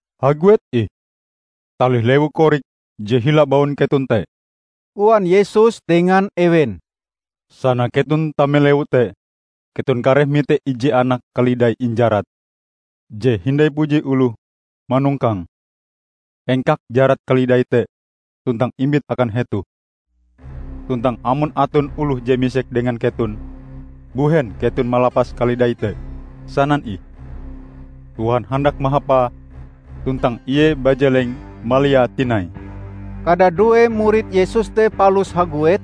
"Haguet ih, talih lewu korik je hila baun keton te," koan Yesus dengan ewen. "Sana keton tame lewu te, keton kareh mite ije anak kalidai injarat, je hindai puji oloh manongkange. Engkak jarat kalidai te tuntang imbit akan hetoh. Tuntang amon aton oloh je misek dengan keton, mbuhen keton malapas kalidai te, sanan ih, 'Tuhan handak mahapae, tuntang Ie bajeleng maliae tinai.' " Kadadue murid Yesus te palus haguet,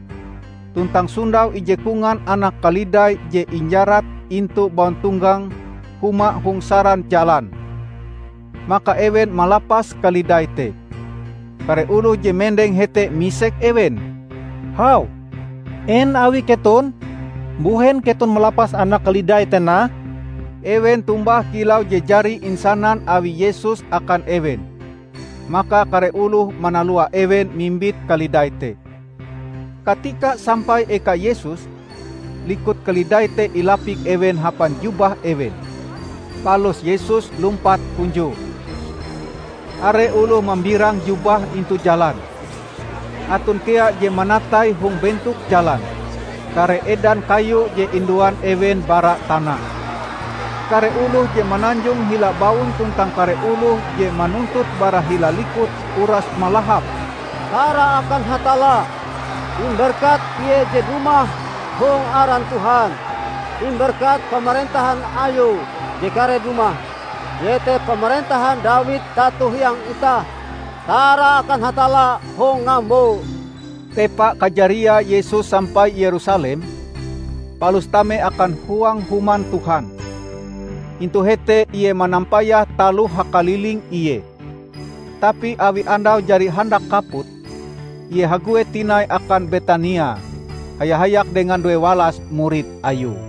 tuntang sondau ije kongan anak kalidai je injarat intu bauntonggang huma hong saran jalan. Maka ewen malapas kalidai te. Kare oloh je mendeng hete misek ewen, "Hau, en awi keton? Mbuhen keton malapas anak kalidai te nah?" Ewen tombah kilau je jari insanan awi Yesus akan ewen. Maka kare oloh manalua ewen mimbit kalidai te. Katika sampai eka Yesus, likut kalidai te ilapik ewen hapan jubah ewen, palus Yesus lumpat hunjue. Are oloh mambirang jubahe intu jalan, aton kea je manatai hong bentok jalan kare edan kayu je induan ewen bara tana. Kare oloh je mananjong hila baun tuntang kare oloh je manuntut bara hila likut, uras malahap, "Tara akan Hatalla! Imberkat Ie je dumah hong aran Tuhan! Imberkat pamarentahan Ayue je kareh dumah -- iete pamarentahan Dawid tato hiang itah! Tara akan Hatalla hong ngambo!" Tepa kajariae Yesus sampai Yerusalem, palus tame akan huang Human Tuhan. Intu hete Ie manampayah taloh hakaliling Ie. Tapi awi andau jari handak kaput, Ie haguet tinai akan Betania haya-hayak dengan duewalas murid Ayue.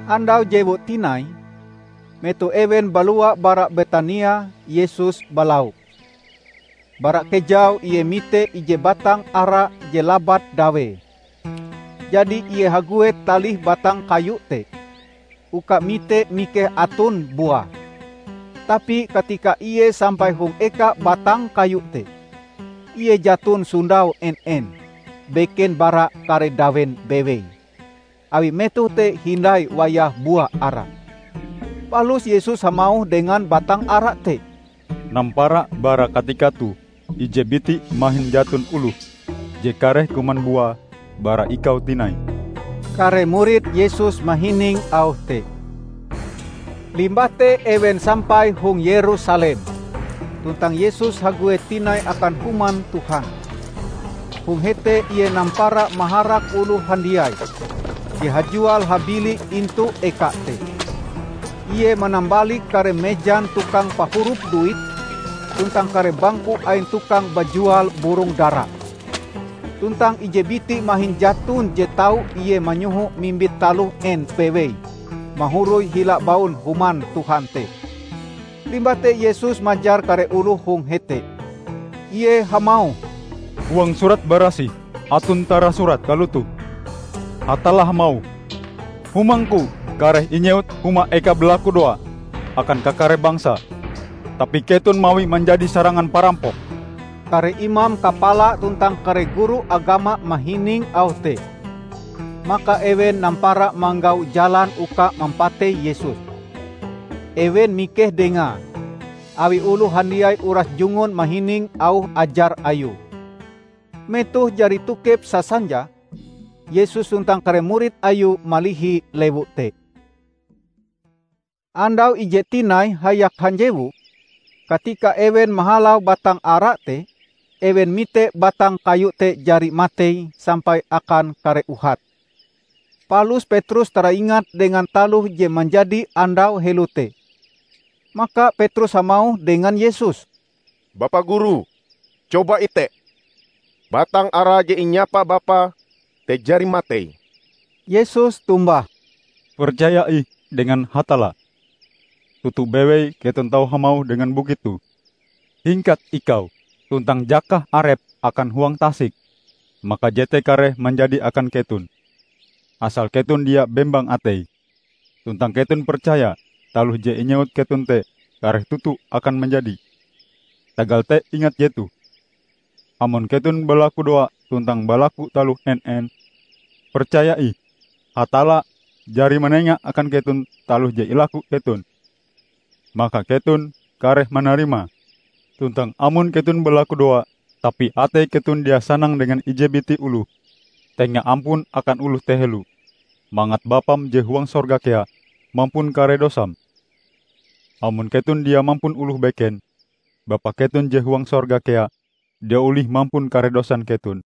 Andau jewue tinai, metoh ewen balua bara Betania, Yesus balau. Bara kejau ie mite ije batang ara je labat dawee. Jadi ie haguet talih batang kayu te uka mite mikeh aton buae. Tapi katika Ie sampai hong eka batang kayu te, Ie jaton sondau en-en, beken bara kare dawen bewei, awi metoh te hindai wayah bua ara. Palus Yesus hamauh dengan batang ara te, "Nampara bara katika toh ije biti mahin jaton oloh je kareh kuman bua bara ikau tinai!" Kare murid Yesus mahining auh te. Limbah te ewen sampai hong Yerusalem, tuntang Yesus haguet tinai akan Human Tuhan. Hong hete Ie nampara maharak oloh handiai je hajual-habili intu eka te. Ie manambalik kare mejan tukang pahurup duit, tuntang kare bangku ain tukang bajual burong dara. Tuntang ije biti mahin jaton je tau Ie manyohoe mimbit taloh en bewei mahoroi hila baun Human Tuhan te. Limbah te Yesus majar kare oloh hong hete. Ie hamauh, "Huang Surat Barasih aton tarasurat kalotoh: Hatalla hamauh, 'Humangku kareh inyewut huma eka balakudoa akan kakare bangsa.' Tapi keton mawie manjadi sarangan parampok!" Kare imam kapala tuntang kare guru agama mahining auh te. Maka ewen nampara manggau jalan uka mampatei Yesus. Ewen mikeh Dengae, awi oloh handiai uras jungun mahining auh ajar Ayue. Metoh jari tokep sasanja, Yesus tuntang kare murid Ayue malihi lewu te. Andau ijee tinai hayak hanjewu, katika ewen mahalau batang ara te, ewen mite batang kayu te jari matei sampai akan kare uhate. Palus Petrus taraingat dengan taloh je manjadi andau heloe te. Maka Petrus hamauh dengan Yesus, "Bapa Guru, coba ite! Batang ara je inyapa Bapa te jari matei!" Yesus tombah, "Percaya ih dengan Hatalla. Toto bewei keton tau hamauh dengan bukit toh, 'Hingkat ikau tuntang jakah arepm akan huang tasik!' Maka jete kareh manjadi akan keton; asal keton dia bembang atei, tuntang keton percaya taloh je inyewut keton te kareh toto akan manjadi. Tagal te ingat jetoh: Amon keton balakudoa tuntang balaku taloh en-en, percaya ih Hatalla jari manenga akan keton taloh je ilaku keton, maka keton kareh manarimae. Tuntang amon keton balakudoa, tapi atei keton dia sanang dengan ije biti oloh, tenga ampun akan oloh te helo, mangat Bapam je huang sorga kea mampun kare dosam. [ Amon keton dia mampun oloh beken, Bapa keton je huang sorga kea dia olih mampun kare dosan keton.]"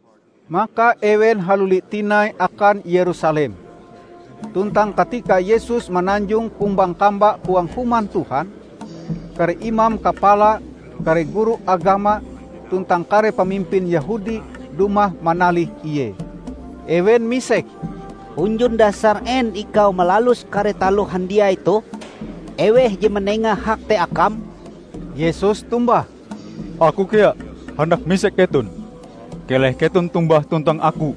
Maka ewen haluli tinai akan Yerusalem. Tuntang katika Yesus mananjong kumbang-kamba huang Human Tuhan, kare imam kapala, kare guru agama tuntang kare pamimpin Yehudi dumah manalih Ie. Ewen misek, "Hunjun dasar en ikau malalus kare taloh handiai toh? Eweh je manenga hak te Akam?" Yesus tombah, "Aku kea handak misek keton. Keleh keton tombah tuntang Aku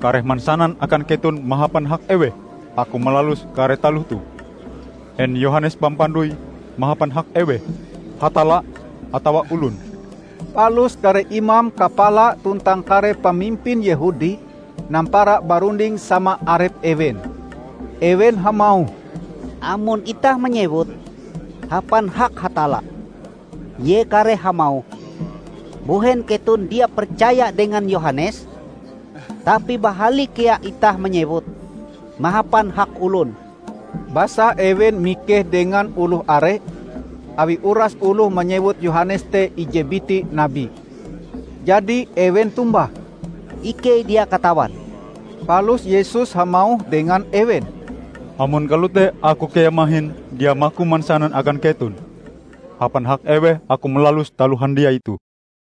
kareh mansanan akan keton mahapan hak eweh Aku malalus kare taloh toh. En Yohanes Pampandoi mahapan hak eweh, Hatalla atawa olon?" Palus kare imam kapala tuntang kare pamimpin Yehudi nampara barunding sama arep ewen. Ewen hamauh, "Amon itah manyewut, 'Hapan hak Hatalla,' ie kareh hamauh, 'Mbuhen keton dia percaya dengan Yohanes?' Tapi bahali kea itah manyewut, 'Mahapan hak olon.' "Basa ewen mikeh dengan oloh are, awi uras oloh manyewut Yohanes te ije biti nabi. Jadi, ewen tombah, "Ikei dia katawan." Palus Yesus hamauh dengan ewen, "Amon kalote Aku kea mahin dia maku mansanan akan keton hapan hak eweh Aku malalus taloh handiai toh."